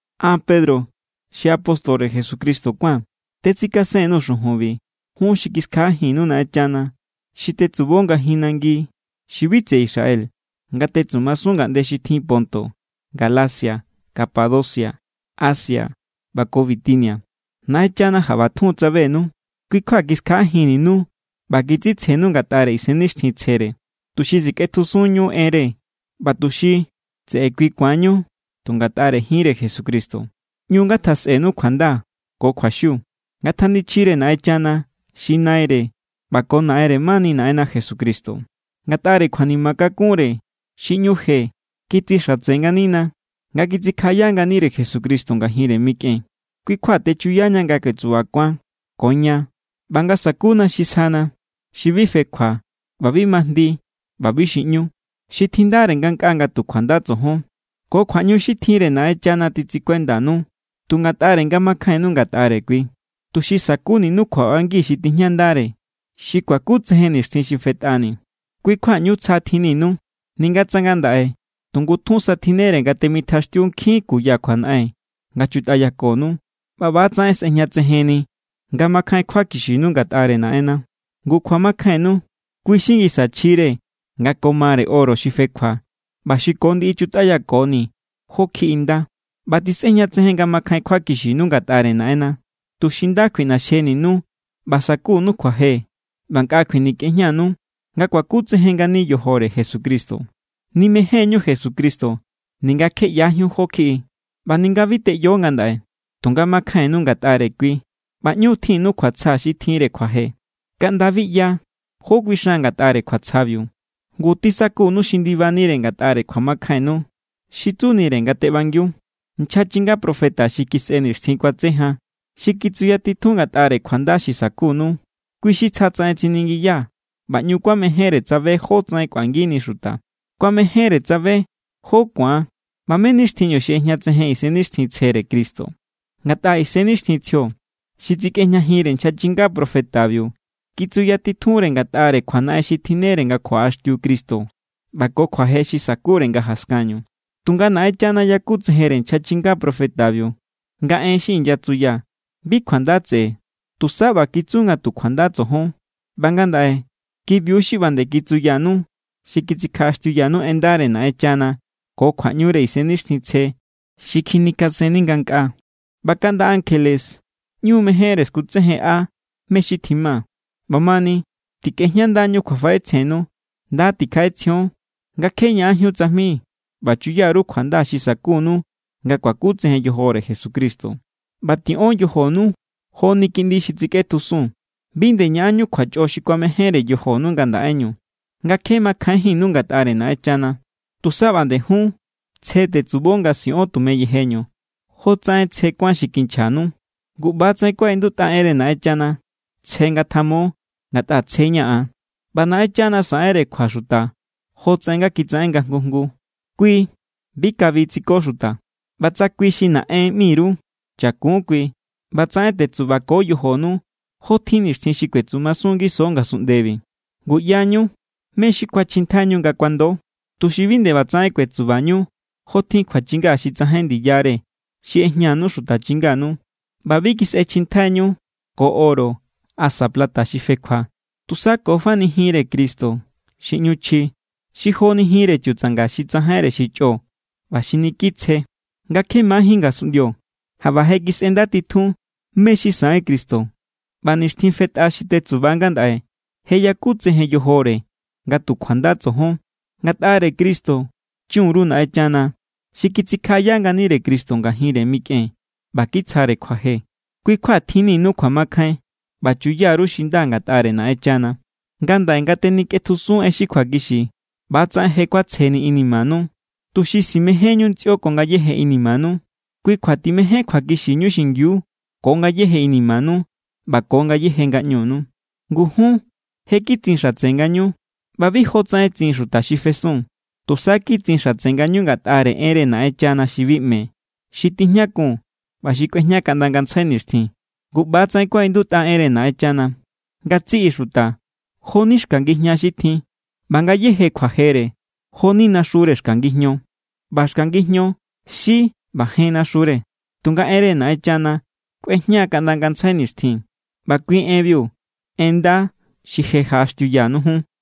An, Pedro, xi apóstore Jesucristo kuáa̱n, tetsikasen_nuu̱ xujunbi jun xi kiskjaꞌajinnú Naꞌenchana, xi tetsubo ngajin nangi xi bi tseꞌe Israel nga tetsumasun ngaꞌnde xi tjin Ponto, Galacia, Capadocia, Asia ꞌba ko Bitinia. Naꞌenchana jaꞌba tjun= tsabenu, kui= kjua kiskjaꞌajinninu ꞌba kitsitsjenu ngatꞌare Isennixtjintsjere, tuxi sikꞌetjusunñu enre ꞌba tuxi tseꞌe kui ku̱anñu tu ngatꞌare jinre Jesucristo. ꞌÑu ngatjasꞌenu kjuanda ko kjuaxiu. Ngatjanichjire Naꞌenchana xi Naire ꞌba ko Naꞌenre mani Naꞌenna Jesucristo. Ngatꞌare kjuanima kakunre xi ꞌñu je kitsixatse nganina, nga kitsikjaꞌaya nganire Jesucristo ngajinre mikꞌen. Kui= kjua techuyaña nga kuetsubakuan ko ña ꞌba nga sakuna xi sjana, xi bi fekjua ꞌba bi majndi ꞌba bi xiꞌñu, xi tjindare ngankꞌaa nga tu kjuanda tsojon. Ko kjuaꞌñu xi tjinre Naꞌenchana titsikuendanu tu ngatꞌare nga makjainnu ngatꞌare kui, tuxi sa̱kuninu kjuaꞌbangi xi tijñandare, xi kuakutsejen nixtjin xi fetꞌani. Kui= kjua ꞌñu tsja tjinninu, ninga tsa ngandaꞌe tu ngutjun sa tjinnere nga temitjaxtiu nkjin kuya kjuanaꞌen nga chutꞌayakonu. ꞌBa ꞌba=tsaꞌen sꞌejñatsejenni nga makjain kjuakixinu ngatꞌare Naꞌenna. Ngu kjuamakjainnu, kui= xi ngisa chjire nga ko mare oro xi fekjua ꞌba xi ko ndiꞌi chutꞌayakoni jó kjiꞌi nda. ꞌBa tisꞌejñatsejen nga makjain kjuakixinu ngatꞌare Naꞌenna, tuxi nda kjuiꞌnaxjeninu ꞌba sa̱kunu kjuaje ꞌba nkꞌa kjuinikꞌejñanu, nga kuakutsejen ngani yojore Jesucristo. Nimején=ñu Jesucristo, ninga kje ꞌyajíun jó= kjiꞌi. ꞌBa ninga bi teꞌyo ngandaꞌe, tunga makjainnu ngatꞌare kui ꞌba ꞌñu= tjinnu kjuatsja xi tjinre kjuaje, kaꞌnda bi ꞌya jó kuixan ngatꞌare kjuatsjabiu. Ngu tisakunu xi ndibanire ngatꞌare kjuamakjainnu, xi tsunire nga teꞌbangiu. Nchja chinga profeta xi kisꞌe nixtjin kuatse jan, xi kitsuyatitjun ngatꞌare kjuanda xi sa̱kunu, kui xi tsjatsaꞌen tsiningiya ꞌba ꞌñu kuamejénre tsabe jótsaꞌen kꞌuangini xuta. Kuamejenre tsabe jó= ku̱an ꞌba mé= nixtjinñu xi ꞌejñatsejen Isennixtjintsjere Cristo, ngatꞌa Isennixtjintsjio xi tsikꞌejñajinre nchja chinga profetabiu kitsuyatitjunre ngatꞌare kjuanaꞌen xi tjinnere nga kjuaꞌaxtiu Cristo ꞌba ko kjuaje xi sa̱kure nga jaskanñu. Tunga Naꞌenchana yakutsejenre nchja chinga profetabiu nga en xi inyatsuya bi kjuanda tseꞌe, tusa ꞌba kitsu nga tu kjuanda tsojon. ꞌBa ngandaꞌe kibiu= xi ꞌba nde kitsuyanu xi kitsikjaꞌaxtiuyanu en ndare Naꞌenchana ko kjuaꞌñure Isennixtjintsje xi kjinikasenni ngankꞌaa. ꞌBa kaꞌnda ankjele ꞌñu mejénre skutsejenꞌa mé= xi tjima. ꞌBamani, tikꞌejñandañu kjuafaꞌetsjennu. Nda tikjaꞌetsjion nga kje ñaꞌanjíun tsajmi ꞌba chuya_ru kjuanda xi sa̱kunu nga kuakutsejen yojore Jesucristo. ꞌBa tiꞌon yojonu joni kiꞌndi xi tsikꞌetjusun. Bi nde ñaꞌanñu kjuachꞌo xi kuamejénre yojonu ngandaꞌeñu, nga kje makjainjínnu ngatꞌare Naꞌenchana. Tusa ꞌba nde jun tsje tetsubo nga siꞌon tume yejeñu, jotsaꞌen tsje kuán xi kinchjanu. Ngu ꞌba=tsaꞌen kuaꞌindutꞌa enre Naꞌenchana: “Tsje ngatjamo, ngatꞌa tsjeña̱ an.” ꞌBa Naꞌenchana saꞌenre kjua xuta jotsaꞌen nga kitsaꞌen nga jngu jngu. Kui bi kabi tsiko xuta. ꞌBa tsa kui xi “Naꞌen” ꞌmi_ru, chakun kui ꞌbatsaꞌen tetsubako yojonu jotjin nixtjin xi kuetsumasun ngiso ngasunꞌndebi. Ngu ꞌyañu mé= xi kuachjintjaiñu nga kuando, tuxi bi nde ꞌbatsaꞌen kuetsubañu jotjin kjuachinga xi tsajain ndiyare xi ꞌejñanu xuta chinganu. ꞌBa bi kisꞌechjintjaiñu ko oro asa plata xi fekjua, tusa ko fani jinre Cristo xi ꞌñu chji, xi joni jinre chutsanga xi tsajainre xi chꞌo ꞌba xi niki tsje. Nga kje majín ngasunꞌndio, jaꞌba je kisꞌendatitjun mé= xi saꞌen Cristo, ꞌba nixtjin fetꞌa xi tetsuba ngandaꞌe je yakutsejen yojore nga tu kjuanda tsojon. Ngatꞌare Cristo chun_ru Naꞌenchana, xi kitsikjaꞌaya nganire Cristo ngajinre mikꞌen ꞌba kitsjare kjuaje. Kui= kjua tjinninu kjuamakjain ꞌba chuya_ru xi nda ngatꞌare Naꞌenchana. Ngandaꞌe nga tenikꞌetjusun en xi kjuakixi, ꞌba=tsaꞌen je kuatsjeni inimanu, tuxi simejenñu ntsꞌio ko ngayéje inimanu. Kui kjua timején kjuakixiñu xingiu ko ngayéje inimanu ꞌba ko ngayéje ngaꞌñunu. Ngu jun je kitsin xatse ngañu ꞌba bi jotsaꞌen tsin xuta xi fesun. Tusa kitsin xatse ngañu ngatꞌare enre Naꞌenchana xi bi ꞌme, xi tijñakun ꞌba xi kꞌuejña kaꞌnda ngantsjai nixtjin. Ngu ꞌba=tsaꞌen kuaꞌindutꞌa enre Naꞌenchana: Ngatsiꞌi xuta, jo=ni xka ngijña xi tjin. ꞌBa ngayéje kjuajere, jo=ni naxure xka ngijño. ꞌBa xka ngijño xí= ꞌba jen naxure, tunga enre Naꞌenchana kꞌuejña kaꞌnda ngantsjai nixtjin. ꞌBa kui enbiu, en nda xi je jaꞌaxtiuyanu jun.